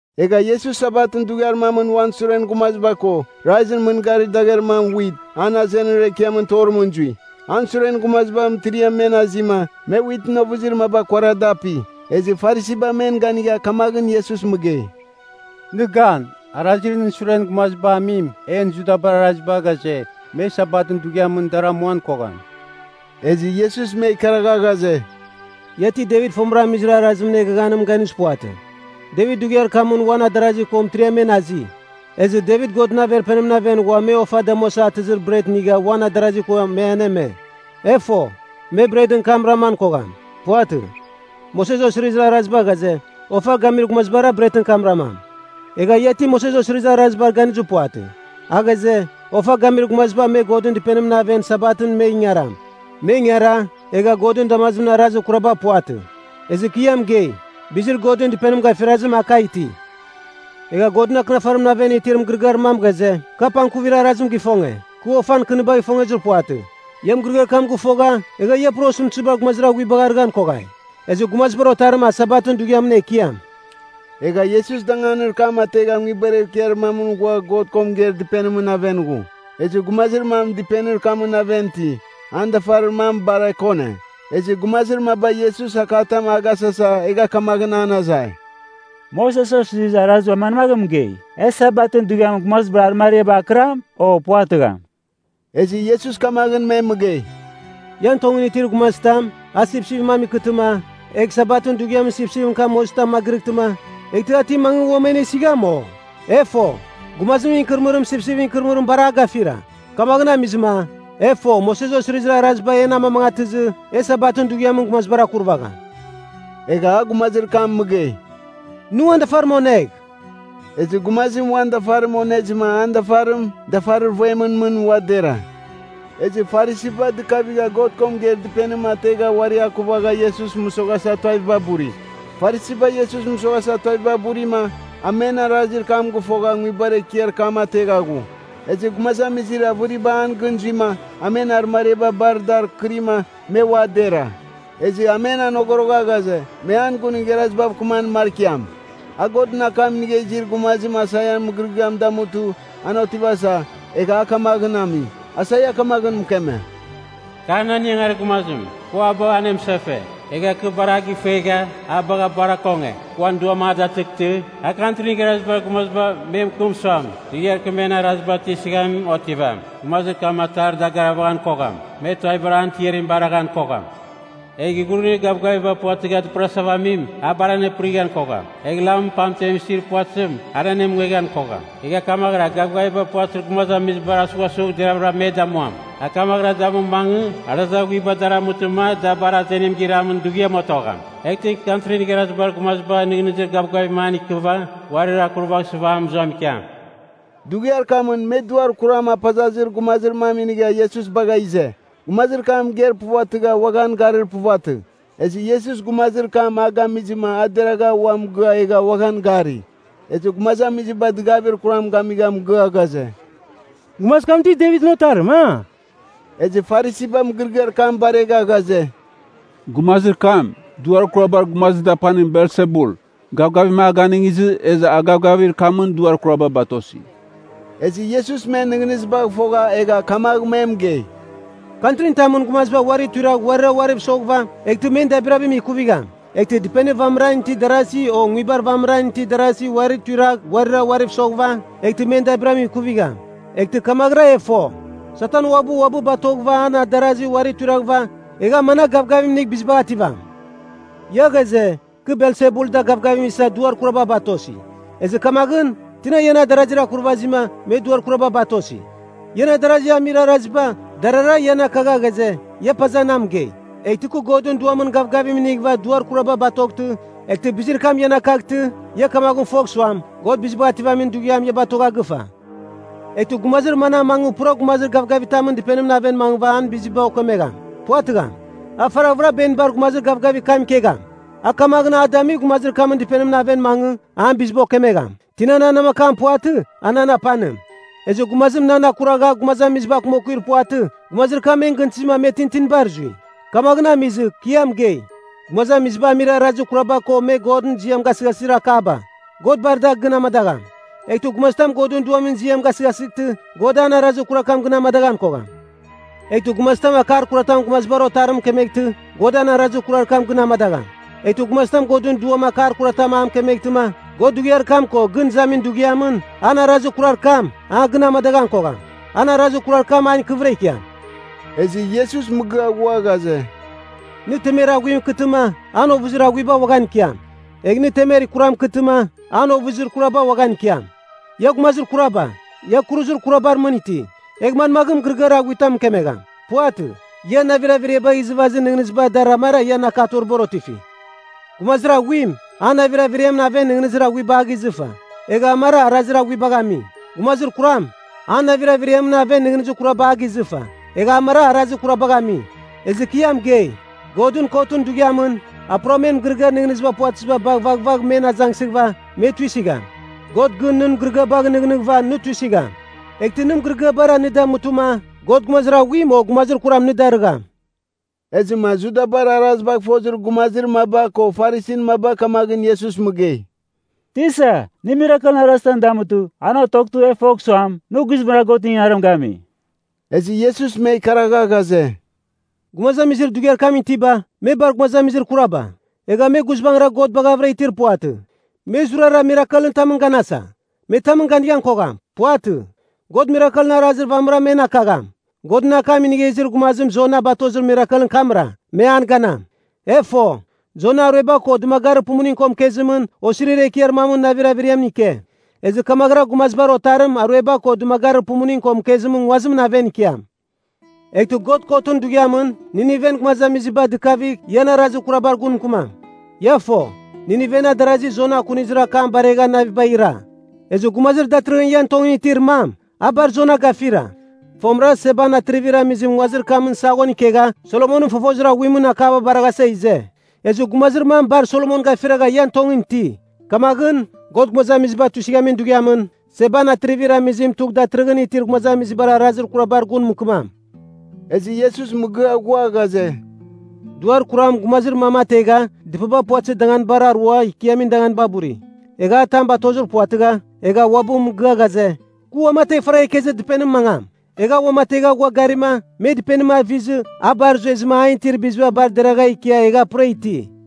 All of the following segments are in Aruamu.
Egha Iesus Sabatɨn dughiar mamɨn uan suren gumaziba ko, raizɨn mɨn garir dagher mam wit, an azenir ekiamɨn torimɨn zui. An suren gumaziba mɨtiriam men azima, me witɨn ovɨzir maba kuara da api. Ezɨ Farisiba men ganigha kamaghɨn Iesus mɨgei, “Nɨ gan, arazir nɨn suren gumaziba amim, en Judabar Araziba ghaze, me Sabatɨn dughiamɨn dar amuan kogham.” Ezɨ Iesus me ikaragha ghaze, “Ia ti Devit fomɨra amizir arazimɨn eghaghanimɨn ganizir puvatɨ? Devit dughiar kamɨn uan adarazi ko mɨtiriam men azi, ezɨ Devit Godɨn Averpenimɨn aven ghua me ofa damuasa atɨzir bret inigha uan adarazi ko me aneme. E fo, me bretɨn kam raman kogham. Puvatɨ, Moses Osirizir Araziba ghaze, ofa gamir gumazibara bretɨn kam ramam. Egha ia ti Moses Osirizir Arazibar ganizir puvatɨ, a ghaze, ofa gamir gumaziba me Godɨn Dɨpenimɨn aven Sabatɨn me ingaram. Me ingara, egha Godɨn damazim arazir kuraba puvatɨ. Ezɨ kɨ ia mɨgei, bizir Godɨn Dɨpenim gafirazim a kagh iti. Egha Godɨn Akɨnafarimɨn aven itir mɨgɨrɨgɨar mam ghaze, ‘Kɨ apangkuvir arazim gifonge, kɨ ofan kɨnibagh ifongezir puvatɨ.’ Ia mɨgɨrɨgɨar kam gɨfogha, egha ia pura osɨmtɨziba gumazir aghuibagh arɨghan koghai. Ezɨ Gumazibar Otarim a Sabatɨn dughiamɨn Ekiam.” Egha Iesus danganir kam ategha nguibar ekiar mamɨn ghua God ko mɨgeir dɨpenimɨn aven ghu. Ezɨ gumazir mam dɨpenir kamɨn aven iti, an dafarir mam bar ekone. Ezɨ gumazir maba Iesus akatam a gasasa, egha kamaghɨn an azai, “Moses Osirizir Araziba manmaghɨn mɨgei? E Sabatɨn dughiamɨn gumazibar arɨmariabar akɨram, o puvatɨgham?” Ezɨ Iesus kamaghɨn me mɨgei, “Ian tongɨn itir gumazitam, a sipsipɨn mam ikɨtɨma, egh Sabatɨn dughiamɨn sipsipɨn kam mozitamɨn magɨrɨghtima, eghtɨ a ti mangɨ uam anesigham, o? E fo, gumazimɨn ikɨrɨmɨrim sipsipɨn ikɨrɨmɨrim bar a gafira! Kamaghɨn amizɨma, e fo Moses Osirizir Araziba en amamangatɨzɨ, e Sabatɨn dughiamɨn gumazibar akurvagham.” Egha a gumazir kam mɨgei, “Nɨ uan dafarim onegh.” Ezɨ gumazim uan dafarim onezɨma an dafarim dafarir vuemɨn mɨn, ua dera. Ezɨ Farisiba dɨkavigha God ko mɨgeir dɨpenim ategha uari akuvagha Iesus mɨsoghasa tuaviba buri. Farisiba Iesus mɨsoghasa tuaviba burima, a men arazir kam gɨfoghava nguibar ekiar kam ategha ghu. Ezɨ gumazamizir avɨriba an gɨn zuima, a men arɨmariaba bar dar kɨrima, me ua dera. Ezɨ a men anogorogha ghaze, me an gun igharazibav kɨman markiam. A Godɨn akam inigha izir gumazim Aisaian mɨgɨrɨgɨam damutɨ, an otivasa, egha a kamaghɨn ami. Aisaia kamaghɨn mɨkeme, “Kar nan ingangarir gumazim, kɨ uabɨ anemɨsefe, egha kɨ bar a gɨfuegha, a bagha bar akonge. Kɨ uan Duam a datɨghtɨ, a Kantrin Igharazibar Gumaziba me mɨkɨm suam, dughiar kɨ men araziba tuisɨghamim otivam. Gumazir kam atar dagarvaghan kogham. Me tuavibar an tiarim baraghan kogham. Egh ighurunir gavgaviba puvatɨgha dɨpɨrasava amim, a bar dɨpɨrighan kogham, egha lamɨn pamtem isir puvatɨzim, an anemungeghan kogham. Egh kamaghɨra, a gavgaviba puvatɨzir gumazamizibar asughasugh deravɨra me damuam. A kamaghɨra damu mangɨ, arazir aghuiba dar amutɨma da bar azenim giramin dughiam otogham. Eghtɨ Kantrin Igharazibar Gumaziba nɨghnɨzir gavgavim an ikɨva uarir akurvaghsɨva a mɨzuam ikiam.” Dughiar kamɨn me duar kuram apazazir gumazir mam inigha Iesus bagha ize. Gumazir kam mɨgeir puvatɨgha uaghan garir puvatɨ. Ezɨ Iesus gumazir kam a gamizɨma a deragha ua mɨgɨa egha uaghan gari. Ezɨ gumazamiziba dɨgavir kuram gamigha mɨgɨa ghaze, “Gumazir kam ti Devitɨn otarim, a?” Ezɨ Farisiba mɨgɨrɨgɨar kam baregha ghaze, “Gumazir kam, duar kurabar gumazir dapanim Belsebul, gavgavim a ganɨngizɨ, ezɨ a gavgavir kamɨn duar kuraba batosi.” Ezɨ Iesus men nɨghnɨzibagh fogha egha kamagh me mɨgei, “Kantrin tamɨn gumaziba uari tuiragh uarira uariv soghɨva, eghtɨ men dabirabim ikuvigham. Eghtɨ dɨpenir vamɨra itir darazi o nguibar vamɨra itir darazi uari tuiragh uarira uariv soghɨva, eghtɨ men dabirabim ikuvigham. Eghtɨ kamaghɨra e fo, Satan uabɨ uabɨ batoghɨva, an adarazi uari tuiraghɨva, egh a managh gavgavim inigh bizibagh ativam. Ia ghaze, kɨ Belsebul da gavgavim isa duar kuraba batosi. Ezɨ kamaghɨn, tina ian adarazir akurvazima, me duar kuraba batosi? Ian adarazi amir araziba, darara ian akagha ghaze, ia paza na mɨgei. Eghtɨ kɨ Godɨn Duamɨn gavgavim inighɨva duar kuraba batoghtɨ, eghtɨ bizir kam ian akaghtɨ, ia kamaghɨn fogh suam, God Bizibagh Ativamin Dughiam ia batogha gɨfa. “Eghtɨ gumazir manam mangɨ pura gumazir gavgavitamɨn dɨpenimɨn aven mangɨva an biziba okemegham? Puvatɨgham. A faraghvɨra benibar gumazir gavgavir kam ikegham. A kamaghɨn a damigh gumazir kamɨn dɨpenimɨn aven mangɨ, an biziba okemegham. “Tina nan namakam puvatɨ, a nan apanim. Ezɨ gumazim nan akuragha gumazamiziba akumakuir puvatɨ, gumazir kam men gɨntɨzima me tintinibar zui. “Kamaghɨn amizɨ, kɨ ia mɨgei, gumazamiziba amir arazir kuraba ko me Godɨn ziam gasɨghasɨzir akaba, God bar da gɨn amadagham. Eghtɨ gumazitam Godɨn Duamɨn ziam gasɨghasɨghtɨ, God an arazir kurar kam gɨn amadaghan kogham. Eghtɨ gumazitam akar kuratam Gumazibar Otarim mɨkemeghtɨ, God an arazir kurar kam gɨn amadagham. Eghtɨ gumazitam Godɨn Duam akar kuratam a mɨkemeghtɨma, God dughiar kam ko gɨn izamin dughiamɨn, an arazir kurar kam, a gɨn amadaghan kogham. An arazir kurar kam an ikɨvɨra ikiam.” Ezɨ Iesus mɨgɨa ghua ghaze, “Nɨ temer aghuim ikɨtɨma, an ovɨzir aghuiba uaghan ikiam. Egh nɨ temer kuram ikɨtɨma, an ovɨzir kuraba uaghan ikiam. Ia gumazir kuraba, ia kuruzir kurabar mɨn iti! Egh manmagh mɨgɨrɨgɨar aghuitam mɨkemegham? Puvatɨ. Ian navir averiabagh izɨvazir nɨghnɨziba dar amara ian akatoribar otifi. Gumazir aghuim, an navir averiamɨn aven nɨghnɨzir aghuiba a gizɨfa, egha amara arazir aghuibagh ami. Gumazir kuram, an navir averiamɨn aven nɨghnɨzir kuraba a gizɨfa, egha amara arazir kurabagh ami. Ezɨ kɨ ia mɨgei, Godɨn Kotɨn Dughiamɨn, a pura men mɨgɨrɨgɨar nɨghnɨziba puvatɨziba bagh vaghvagh men azangsɨghɨva, me tuisɨgham. God gɨn nɨn mɨgɨrɨgɨabagh nɨghnɨghɨva, nɨ tuisɨgham, eghtɨ nɨn mɨgɨrɨgɨabara nɨ damutɨma, God gumazir aghuim o gumazir kuram nɨ darɨgham.” Ezɨma Judabar arazibagh fozir gumazir maba ko Farisin maba kamaghɨn Iesus mɨgei, “Tisa, nɨ mirakelɨn arazitam damutɨ, an otoghtɨ e fogh suam, nɨ guizbangɨra Godɨn ingangarim gami.” Ezɨ Iesus me ikaragha ghaze, “Gumazamizir dughiar kamɨn itiba, me bar gumazamizir kuraba! Egha me guizbangɨra God baghavɨra itir puvatɨ. Me zurara mirakelɨn tamɨn ganasa. Me tamɨn ganighan kogham. Puvatɨ. God mirakelɨn arazir vamɨra men akagham. Godɨn akam inigha izir gumazim Jona batozir mirakelɨn kamra, me an ganam. E fo, Jona arueba ko dɨmagarir pumuning ko mɨkezimɨn osirir ekiar mamɨn navir averiamɨn ike. Ezɨ kamaghɨra Gumazibar Otarim arueba ko dɨmagarir pumuning ko mɨkezimɨn nguazimɨn aven ikiam. Eghtɨ God Kotɨn Dughiamɨn, Niniven gumazamiziba dɨkavigh ian arazir kurabar gun mɨkɨmam. Ia fo, Nineven adarazi Jona akunizir akam baregha navibagh ira. Ezɨ Gumazir datɨrɨghɨn ian tongɨn itir mam, a bar Jona gafira! Fomɨra Seban Atrivir Amizim nguazir kamɨn saghon ikegha Solomonɨn fofozir aghuimɨn akaba baraghasa ize. Ezɨ gumazir mam bar Solomon gafiragha ian tongɨn iti. Kamaghɨn, God gumazamizibar Kotim Damuamin Dughiamɨn, Seban Atrivir Amizim tugh datɨrɨghɨn itir gumazamizibar arazir kurabar gun mɨkɨmam.” Ezɨ Iesus mɨgɨa ghua ghaze, “Duar kuram gumazir mam ategha dɨpaba puvatɨzir danganibar arua ikiamin danganiba buri, egha a tam batozir puvatɨgha, egha uabɨ mɨgɨa ghaze, ‘Kɨ uamategh faragha ikezir dɨpenimɨn mangam.’ Egha a uamategha ghua garima, me dɨpenim avizɨ, a bar zuezɨma an itir biziba bar deragha ikia egha pura iti.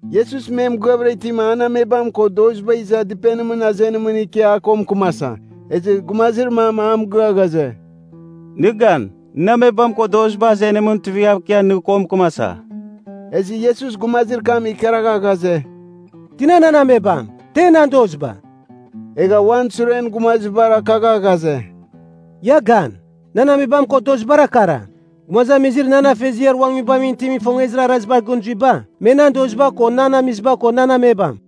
Iesus me mɨgɨavɨra itima, an amebam ko doziba iza dɨpenimɨn azenimɨn ikia a ko mɨkɨmasa. Ezɨ gumazir mam a mɨgɨa ghaze, “Nɨ gan, nɨn amebam ko doziba azenimɨn tuivighav ikia nɨ ko mɨkɨmasa.” Ezɨ Iesus gumazir kam ikaragha ghaze, “Tina nan amebam? Te nan doziba?” Egha uan suren gumazibar akagha ghaze, “Ia gan! Nan amebam ko dozibara kara. Gumazamizir nan Afeziar uan Nguibamɨn itim ifongezir arazibar gɨn zuiba, me nan doziba ko nan amiziba ko nan amebam.”